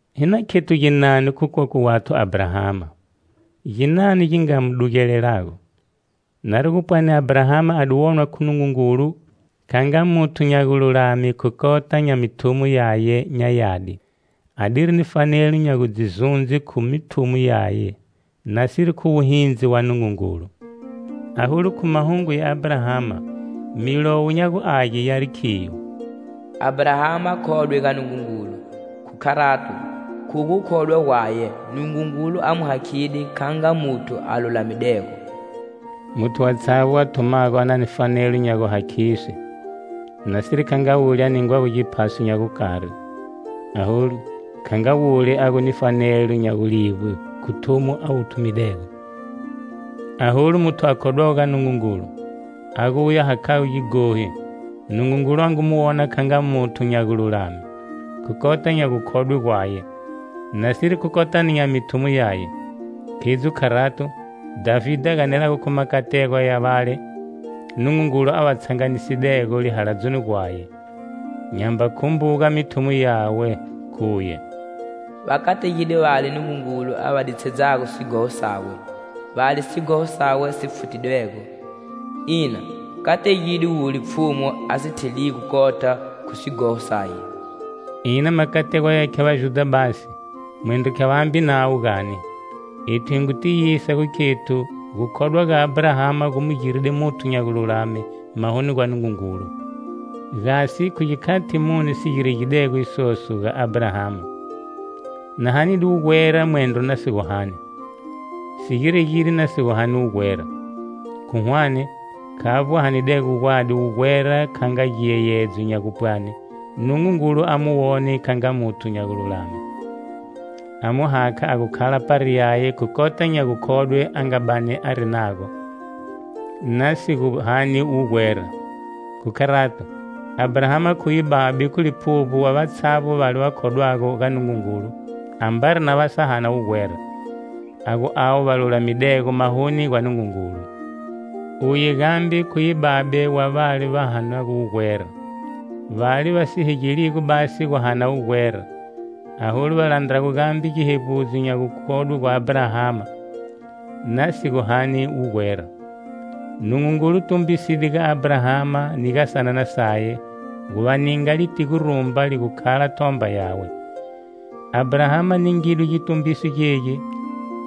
Hi na khethu ginani khu kokwe wathu Abrahama? Ginani gi nga mu dugelelago? Nari gu pwani Abrahama a di wonwa khu Nungungulu kha nga muthu nya gululame khu kota nya mithumo yaye nya yadi, adiri ni fanelo nya gu dzi zundze khu mithumo yaye, nasiri khu wuhindzi wa Nungungulu. Aholu, khu mahungu ya Abrahama, Milowo nya gu Age yari khiyo: "Abrahama khodwe ga Nungungulu, khu kharato, khu gukhodwa gwaye Nungungulu a mu hakhide kha nga muthu a lulamidego." Muthu watshavbo a thumago a na ni fanelo nya guhakhiswe, nasiri kha nga wule a ningwago giphaso nya gukari, aholu, kha nga wule a gu ni fanelo nya gulivbwe khu thumo a wu thumidego. Aholu, muthu a khodwago ga Nungungulu, a gu uye a hakhago gighohi, Nungungulu a ngu mu wona kha nga muthu nya gululame, khu kota nya gukhodwe gwaye, nasiri khu kotani nya mithumo yaye. Khidzo kharato, Dhavide a ganelago khu makategwa ya vale Nungungulu a va tshanganisidego lihaladzoni gwaye, nyamba khumbuga mithumo yawe, khuye: "Va kategide vale Nungungulu a va ditshedzago sighoho sawe,Vale sighoho sawe si futidwego! Ina, kategide wule Pfhumu a si theligo kota khu sighoho saye." Ina makategwa yaya khya Vajudha basi, mwendro khya vambe navo gani? Ethu hi ngu tiyisa nya gukhethu gukhodwa gwa Abrahama gu mu giride muthu nya gululame mahoni gwa Nungungulu. Gasi khu gikhati muni si giregidego isoso ga Abrahama? Na hanide wugwera mwendro na si gu hani? Si giregide na si gu hani wugwera. Khu hwane, khavbo a hanidego gwadi wugwera kha nga giyeyedzo nya gupwani Nungungulu a mu wone kha nga muthu nya gululame, a mu hakha a gu khala pari yaye khu kota nya gukhodwe a nga bani ari nago, na si gu hani wugwera. Khu kharato, Abrahama khuye babe khu liphuvbo wa vatshavbo vale va khodwago ga Nungungulu ambari na va sa hana wugwera, a gu avo va lulamidego mahoni gwa Nungungulu. Uye gambe khuye babe wa vale va hanago wugwera, vale va si hegeligo basi gu hana wugwera, aholu va landrago gambe gihevbudzo nya gukhodwe gwa Abrahama na si gu hani wugwera. Nungungulu tumbiside ga Abrahama ni ga sanana saye gu va ninga litigo rumba li gu khala thomba yawe. Abrahama ningidwe gitumbiso gegi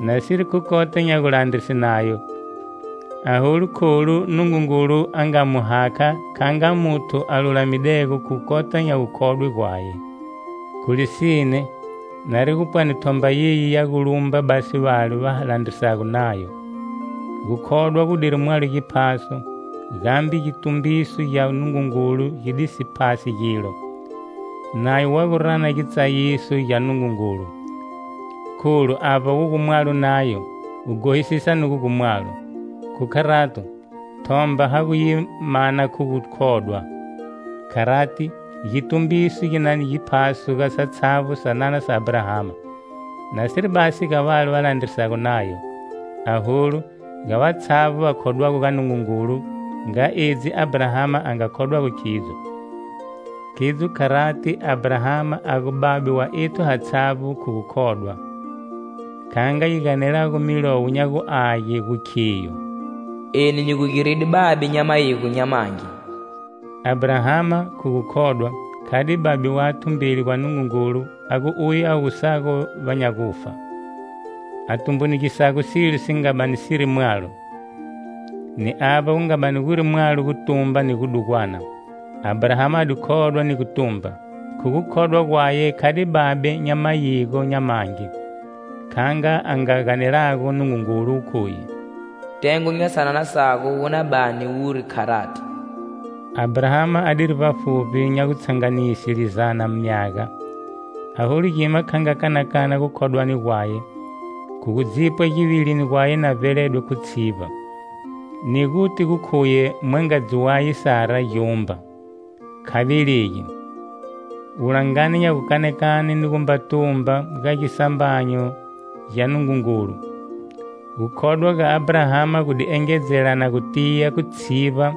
nasiri khu kota nya gulandrise Nayo, aholu kholu Nungungulu a nga mu hakha kha nga muthu a lulamidego khu kota nya gukhodwe gwaye. Khu lisine, nari gu pwani thomba yeyi ya gu lumba basi vale va landrisago Nayo, gukhodwa gudiri mwalo giphaso, gambe gitumbiso gya Nungungulu gi di si phasi gilo. Nayo wa gu rana gitsayiso gya Nungungulu, kholu avba wu gu mwalo Nayo, guhosisa nugo gu mwalo. Khu kharato, thomba ha gu yi mana khu gukhodwa. Kharati, gitumbiso gi na ni giphaso ga satshavbo sanana sa Abrahama, nasiri basi ga vale va landrisago Nayo, aholu, ga vatshavbo va khodwago ga Nungungulu nga edzi Abrahama a nga khodwago khidzo. Khidzo kharati Abrahama a gu babe wa ethu hatshavbo khu gukhodwa, kha nga yi ganelago Milowo nya gu Age yi gu khiyo: "Eni nyi gu giride babe nya mayigo nya mangi." Abrahama, khu gukhodwa, khade babe wathu mbeli gwa Nungungulu a gu uye a wusago va nya gufa, a tumbunugisago silo si nga bani siri mwalo. Ni avba gu nga bani guri mwalo gutumba ni gudugwana, Abrahama a di khodwa ni gutumba. Khu gukhodwa gwaye khade babe nya mayigo nya mangi, kha nga a nga ganelago Nungungulu khuye: "Tengo nya sanana sago wu na bani wuri kharati." Abrahama adiri vbafuvbi nya gutshanganise lizana myaga, aholu gima kha kanakana gukhodwani gwaye khu gu dzipwa givilini gwaye na vbeledwe khu tshivba, ni guti gu khuye mwangadzi waye Sara gyumba, kha velegi. Wulangani nya gukanakane ni gumba tumba ga gisambanyo gya Nungungulu, gukhodwa ga Abrahama gu di engedzelana gu tiya khu tshivba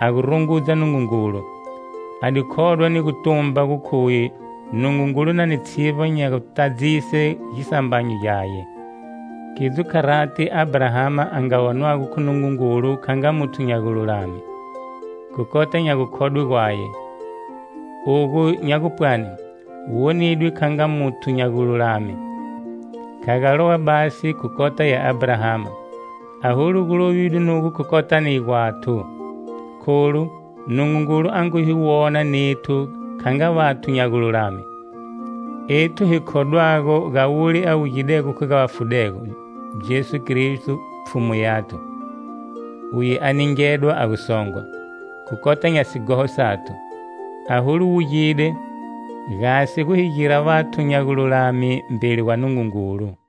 a gu rungudza Nungungulu. A di khodwa ni gu tumba gu khuye Nungungulu na ni tshivba nya gutadzise gisambanyo gyaye. Khidzo kharati Abrahama a nga wonwago khu Nungungulu kha nga muthu nya gululame, khu kota nya gukhodwe gwaye. Ogu nya gupwani: "Wonidwe kha nga muthu nya gululame" kha ga lowa basi khu kota ya Abrahama. Aholu gu lovidwe nugo khu kotani gwathu. Kholu Nungungulu a ngu hi wona nethu kha nga vathu nya gululame, ethu hi khodwago ga wule a wugidego khu ga vafudego, Jesu Kristo, Pfhumu yathu. Uye a di ningedwa a gu songwa khu kota nya sighoho sathu, aholu wugide gasi gu hi gira vathu nya gululame mbeli gwa Nungungulu.